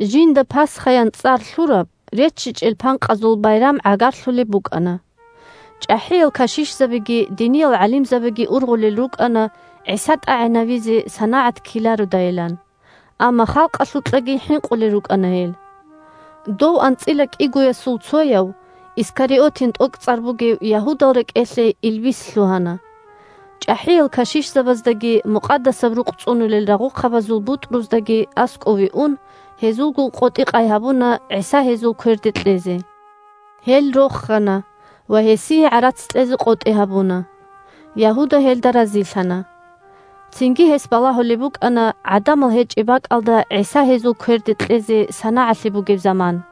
Жинда Пасхаян цӀар лъураб РеччичӀел Панкъазул Байрам гӀагарлъулеб букӀана. ЧӀахӀиял кашишзабиги диниял гӀалимзабиги ургъулел рукӀана ГӀиса тӀагӀинавизе санагӀат ккелародайилан, амма халкъалъукьаги хӀинкъулел рукӀана гьел. Дов анцӀила кӀигоясул цояв, Искариотин тӀокӀцӀар бугев Ягьудал рекӀелъе илбис лъугьана. ЧӀахӀиял кашишзабаздаги Мукъадасаб Рукъ цӀунулел рагъухъабазул бутӀруздаги аскӀове ун, гьезулгун къотӀи-къай гьабуна ГӀиса гьезул кверде кьезе. Гьел рохана ва гьесие гӀарац кьезе къотӀи гьабуна. Ягьуда гьелда разилъана. Цинги гьес балагьулеб букӀана гӀадамал гьечӀеб бакӀалда ГӀиса гьезул кверде кьезе санагӀалъи бугеб заман.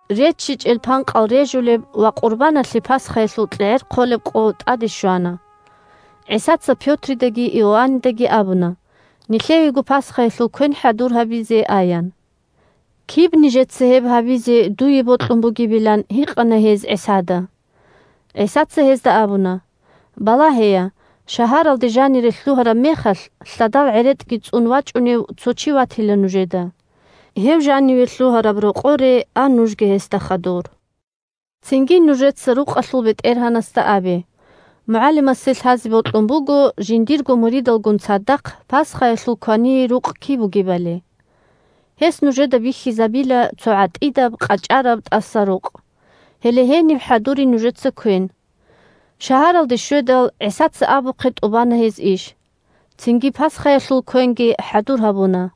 РеччичӀел панкъал режулеб ва къурбаналъе пасхаялъул кьегӀер хъолеб къо тӀаде щвана. ГӀисаца Пётридаги Иоаннидаги абуна, нилъеего пасхаялъул квен хӀадур гьабизе аян. Киб нижеца гьеб гьабизе дуе бокьун бугебилан гьикъана гьез ГӀисада. ГӀисаца гьезда абуна: – Балагьея, шагьаралде жанире лъугьараб мехалъ, лъадал гӀеретӀги цӀун вачӀунев цо чи ватила нужеда. Гьев жаниве лъугьараб рокъоре а нужги гьесда хадур. Цинги нужеца рукъалъул бетӀергьанасда абе: «МугӀалимасе лъазе бокьун буго жиндирго муридалгун цадахъ пасхаялъул квание рукъ киб бугебали». Гьес нужеда бихьизабила цо гӀатӀидаб къачӀараб тӀасарукъ. Гьеле гьениб хӀадуре нужеца квен. Шагьаралде щведал, ГӀисаца абухъе тӀубана гьез иш. Цинги пасхаялъул квенги хӀадур гьабуна.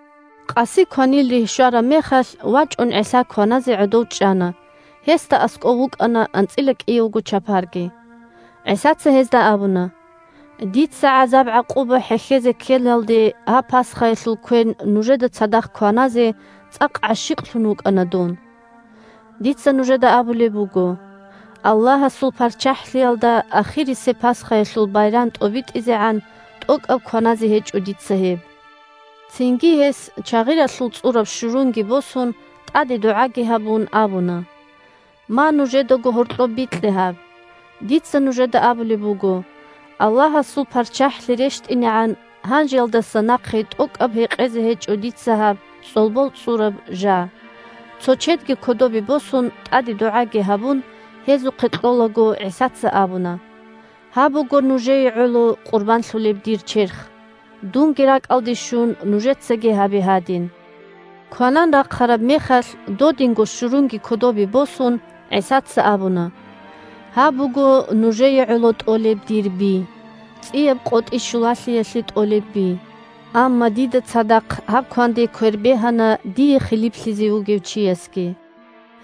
Къаси кванил ригь щвараб мехалъ, вачӀун ГӀиса кваназе гӀодов чӀана, гьесда аскӀов вукӀана анцӀила кӀиявго чапарги. ГӀисаца гьезда абуна: – Дица гӀазаб-гӀакъуба хӀехьезе ккелалде гьаб Пасхаялъул квен нужеда цадахъ кваназе цӀакъ гӀащикълъун вукӀана дун. Дица нужеда абулеб буго: Аллагьасул ПарччахӀлъиялда ахирисеб пасхаялъул байрам тӀобитӀизегӀан тӀокӀаб кваназе гьечӀо дица гьеб. Цинги гьес, чагъиралъул цӀураб щурунги босун, тӀаде дугӀаги гьабун, абуна: – Ма, нужедаго гьоркьоб бикье гьаб. Дица нужеда абулеб буго: Аллагьасул ПарччахӀлъи рещтӀинегӀан гьанжеялдаса нахъе тӀокӀаб гьекъезе гьечӀо дица гьаб цӀолбол цӀцӀураб жа. Цо чедги кодобе босун, тӀаде дугӀаги гьабун, гьезухъе кьолаго ГӀисаца абуна: – Гьаб буго нужее гӀоло къурбанлъулеб дир черх. Дунги ракӀалде щун, нужецаги гьабе гьадин. Кванан рахъараб мехалъ, додинго щурунги кодобе босун, ГӀисаца абуна: – Гьаб буго нужее гӀоло тӀолеб дир би – ЦӀияб КъотӀи щулалъиялъе тӀолеб би. Амма дида цадахъ гьаб кванде квер бегьана дие хилиплъизе вугев чиясги.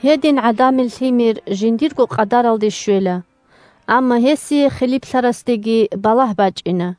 Гьедин ГӀадамил Лъимер жиндирго къадаралде щвела, амма гьесие хилиплъарасдеги балагь бачӀина.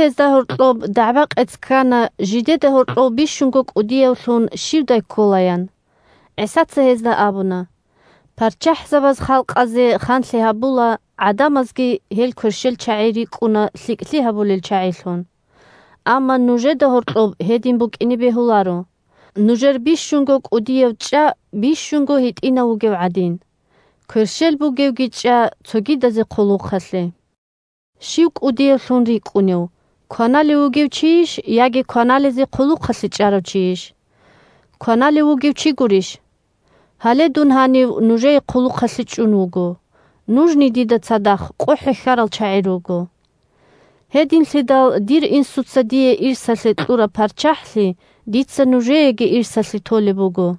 Цоги гьезда гьоркьоб дагӀба-къец ккана жидеда гьоркьов бищунго кӀудиявлъун щивдай кколаян. ГӀисаца гьезда абуна: – ПарччахӀзабаз халкъазе ханлъи гьабула, гӀадамазги гьел кверщелчагӀи рикӀкӀуна лъикӀлъи гьабулел чагӀилъун. Амма нужеда гьоркьоб гьедин букӀине бегьуларо: нужер бищунго кӀудияв чӀа бищунго гьитӀинав вугев гӀадин, кверщел бугевги чӀа цогидазе хъулухъалъе. Щив кӀудиявлъун рикӀкӀунев: кваналев вугев чийищ яги кваналезе хъулухъалъе чӀарав чийищ? Кваналев вугев чи гурищ? Гьале дун гьанив нужее хъулухъалъе чӀун вуго. Нужни дида цадахъ къо хӀехьарал чагӀи руго. Гьединлъидал дир Инсуца дие ирсалъе кьураб ПарччахӀлъи дица нужееги ирсалъе толеб буго.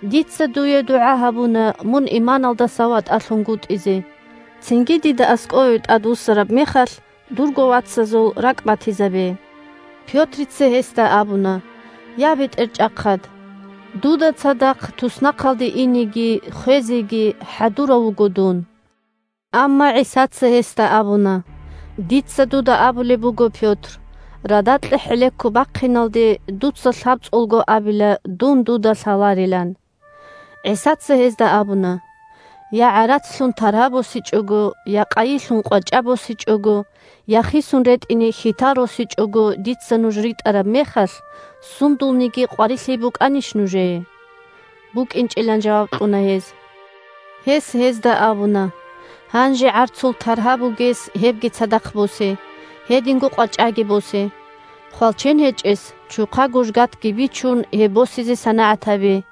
Дица дуе дугӀа гьабуна мун иманалдаса ватӀалъунгутӀизе, цинги дида аскӀове тӀадвуссараб мехалъ, дурго вацазул ракӀбатизабе. Пётрица гьесда абуна: – Я, БетӀерчӀахъад! Дуда цадахъ туснахъалде инеги хвезеги хӀадурав вуго дун. Амма ГӀисаца гьесда абуна: – Дица дуда абулеб буго, Пётр: радакье хӀелеко бахъиналде дуца лъабцӀулго абила дун дуда лъаларилан. ГӀисаца гьезда абуна: – Я гӀарац лъун таргьа босичӀого, я къайи лъун къвачӀа босичӀого, я хисун ретӀине хьитал росичӀого дица нуж ритӀараб мехалъ, сундулниги къварилъи букӀанищ нужее? БукӀинчӀилан жаваб кьуна гьез. Гьес гьезда абуна: – Гьанже гӀарцул таргьа бугес гьебги цадахъ босе, гьединго къвачӀаги босе. Хвалчен гьечӀес, чухъа-гужгатги бичун, гьеб босизе санагӀат гьабе.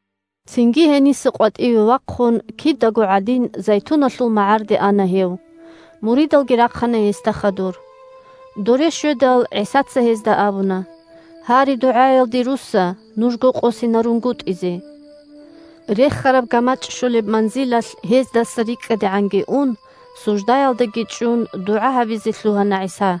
Цинги гьениса къватӀиве вахъун, кидаго гӀадин, Зайтуналъул магӀарде ана гьев, муридалги рахъана гьесда хадур. Доре щведал, ГӀисаца гьезда абуна: – Гьари-дугӀаялде русса, нужго къосинарунгутӀизе. Рехараб гамачӀ щолеб манзилалъ гьездаса рикӀкӀадегӀанги ун, суждаялдаги чӀун, дугӀа гьабизе лъугьана ГӀиса.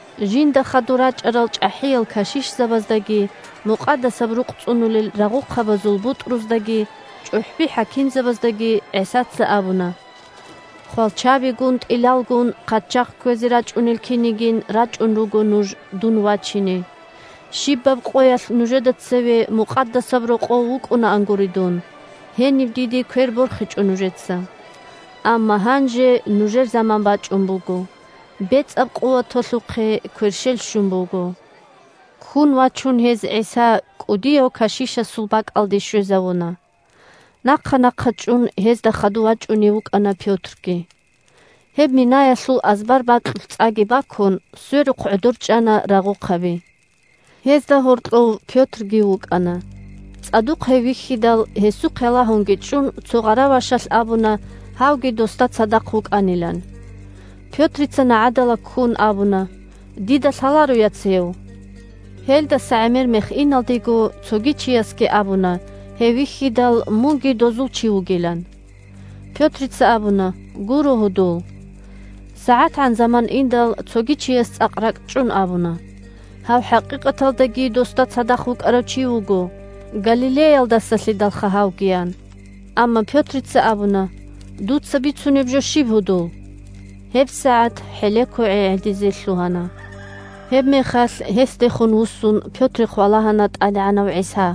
Жинда хадур рачӀарал чӀахӀиял кашишзабаздаги, Мукъадасаб Рукъ цӀунулел рагъухъабазул бутӀруздаги, чӀухӀби-хӀакимзабаздаги ГӀисаца абуна: – Хвалчабигун, тӀилалгун, хъачагъ кквезе рачӀунел кинигин, рачӀун руго нуж дун вачине. Щибаб къоялъ нужеда цеве Мукъадасав Рокъов вукӀунаангури дун, гьениб диде квер борхичӀо нужеца. Амма гьанже нужер заман бачӀун буго, бецӀаб къуваталъухъе ШайтӀан-илбис абураб магӀна буго гьелъул. кверщел щун буго. Ккун вачун гьез ГӀиса кӀудияв кашишасул бакӀалде щвезавуна. Нахъа-нахъа чӀун гьезда хадув вачӀунев вукӀана Пётрги. Гьеб минаялъул азбар бакьулъ цӀаги бакун, сверухъ гӀодор чӀана рагъухъаби. Гьезда гьоркьов Пётрги вукӀана. ЦӀадухъ гьев вихьидал, гьесухъ ялагьунги чӀун, цо гъаравашалъ абуна гьавги досда цадахъ вукӀанилан. Пётрица, нагӀадала ккун, абуна: – Дида лъаларо, яц, гьев. Гьелдаса гӀемер мех иналдего, цоги чиясги абуна, гьев вихьидал, мунги дозул чи вугилан. Пётрица абуна: – Гуро, гьудул. СагӀатгӀан заман индал, цоги чияс цӀакъ ракӀчӀун абуна: – Гьав хӀакъикъаталдаги досда цадахъ вукӀарав чи вуго, Галилеялдасалъидалха гьавги, – ян. Амма Пётрица абуна: – Дуца бицунеб жо щиб, гьудул? ГьебсагӀат хӀелеко гӀегӀедизе лъугьана. Гьебмехалъ гьесдехун вуссун Пётрихъ валагьана ТӀадегӀанав ГӀиса,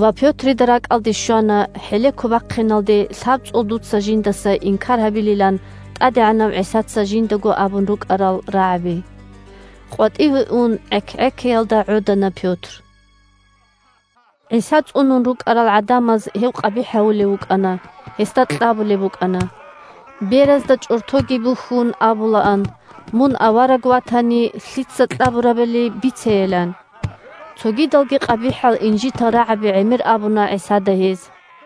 ва Пётрида ракӀалде щвана хӀелеко бахъиналде лъабцӀул дуца жиндаса инкар гьабилилан ТӀадегӀанав ГӀисаца жиндаго абун рукӀарал рагӀаби. КъватӀиве ун гӀек-гӀекиялда гӀодана Пётр. ГӀиса цӀунун рукӀарал гӀадамаз гьев къабихӀ гьавулев вукӀана, гьесда кьабулеб букӀана. Беразда чӀортоги бухьун абулаан, мун авараг ватани, лъица кьабурабали бицейилан. Цогидалги къабихӀал-инжитал рагӀаби гӀемер абуна ГӀисада гьез.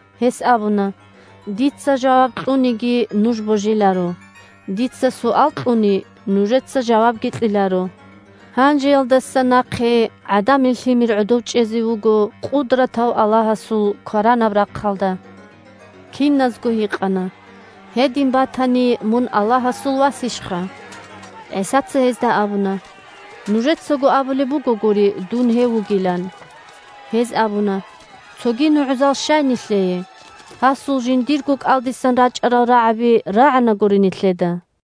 Гьес абуна: – Дица жаваб кьуниги, нуж божиларо. Дица суал кьуни, нужеца жавабги кьеларо. Гьанжеялдаса нахъе ГӀадамил Лъимер гӀодов чӀезе вуго Къудратав Аллагьасул кваранаб рахъалда. Киназго гьикъана: – Гьедин батани, мун Аллагьасул Васищха? ГӀисаца гьезда абуна: – Нужецаго абулеб бугогури дун гьев вугилан. Гьез абуна: – Цоги нугӀзал щай нилъее. Гьасул жиндирго кӀалдисан рачӀарал рагӀаби рагӀанагури нилъеда.